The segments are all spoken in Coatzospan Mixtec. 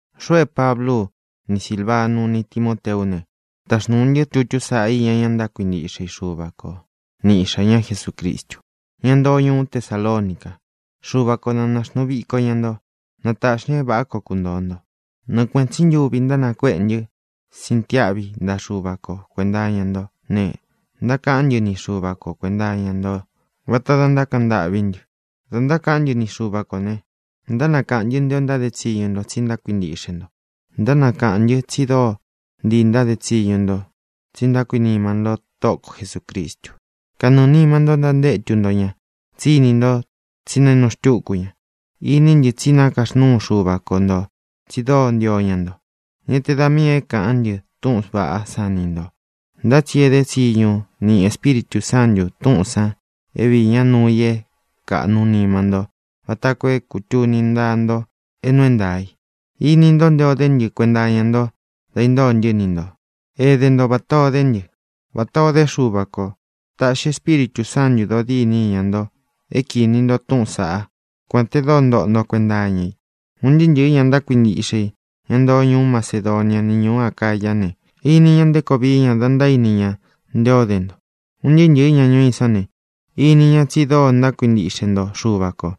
Xuʼu é Pablú u, ni Sīlvanu, ni Timóteú ne, taxnūu ntɨ́ tutú saʼa iña ña kuíntiʼxe i Xuva ko ni Iʼxā ñá Jesucristu, ñá ntoo ñuú Tesalonica. Xuva ko na nāxnuu viko ña nto. Na tāʼxi ña é vāʼá koo kuntōo nto. Nɨɨ kuēʼen tsí ntuvi ntánakueʼe ntɨ́ sintiáʼvi ntaʼa Xuva ko kuēnta iña ntó ne, ntákaʼán ntɨ ni Xuva ko kuēnta iña nto vata da ntákaʼan ntâʼví ntɨ. Dā ntákaʼán ntɨ ni Xuva kō ne, ntánakaʼān ntɨ́ nté ō ntáde tsiñu nto tsí ntákuintiʼxe nto. Ntánakaʼān ntɨ́ tsi dóo ntii ntáde tsiñu nto tsí ntákuinima ntó Tóʼo ko Jesūcristu. Kanɨɨ̄ nima ntó ntantétu nto ña, tsí ini nto tsí nainu xtúku ña. Iní ntɨ tsí nakaxnúu Xuva ko ntō tsi dóo ntio ña nto. Ñá te da miī é kāʼán ntɨ túʼūn vaʼá san ni ntō, ntá tsi é dé tsiñu niʼi Espíritū Sántu tūʼún san é viī ñá uun nuu i é kāʼnu nima ntó vata koo é kūtuni ntaá nto é nuu é ntaā i. Ini ntó nte o dé ntɨ kuenta iña nto da intóo ntɨ́ ni ntō. Ēdé nto vatā o dé ntɨ, vatā o dé Xuva kō. Tāʼxi Espíritū Sántū dodíni iña nto é kīni nto túʼūn saʼá, kuān te dóo ntóʼo nto kuenta iña i. Un ntɨɨ́ ntɨ̄ɨ́ ña kuíntiʼxe i, ña ntoo ñuú Macedonia ni ñūú Acayá ne, ini ña nté koo vií ña da ntaíni ña nté o de nto. Un ntɨɨ́ ntɨ̄ɨ́ ña ñuú i sán ne, ini ña tsi dóo ntákuintiʼxe nto Xuva kō,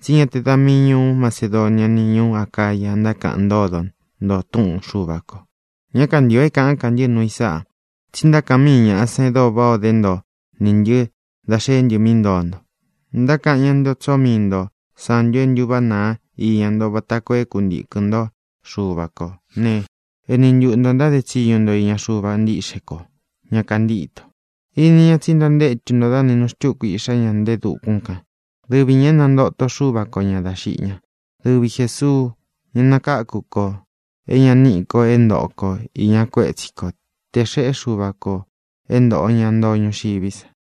tsí ña te da míi ñūú Macedonia ni ñūú Acaya ntákaʼan ntódo nto túʼun Xuva kō. Ñá kantio é kāʼán ka ntɨ́ nuu i sáʼā, tsi ntákaʼan míi ñāʼa san e dóo váʼā o dé nto nī ntɨ́ dá xeé ntɨ mí ntoo nto. Ntákaʼan ña nté o tsóo mii nto santu e ntúváʼa nāa íña nto vata koo é kuntīkɨn ntó Xuva kō né, ēni ntuʼu nto ntáde tsiñu nto iña Xuva ntíʼxe kō, ña kantíto. Ini ñá tsi ntantétu nto dá nainu xtúku Iʼxá ña nte e dukún kān, dɨvi ñā é nantōto Xuva ko ña dá xiʼi ñá, dɨvi Jēsuu, ña nakáku kō é ña níʼi kō é ntōʼo ko iña kuétsi ko tē xeʼé Xuva kō é ntōʼo ña ntoo ñuxiví sa.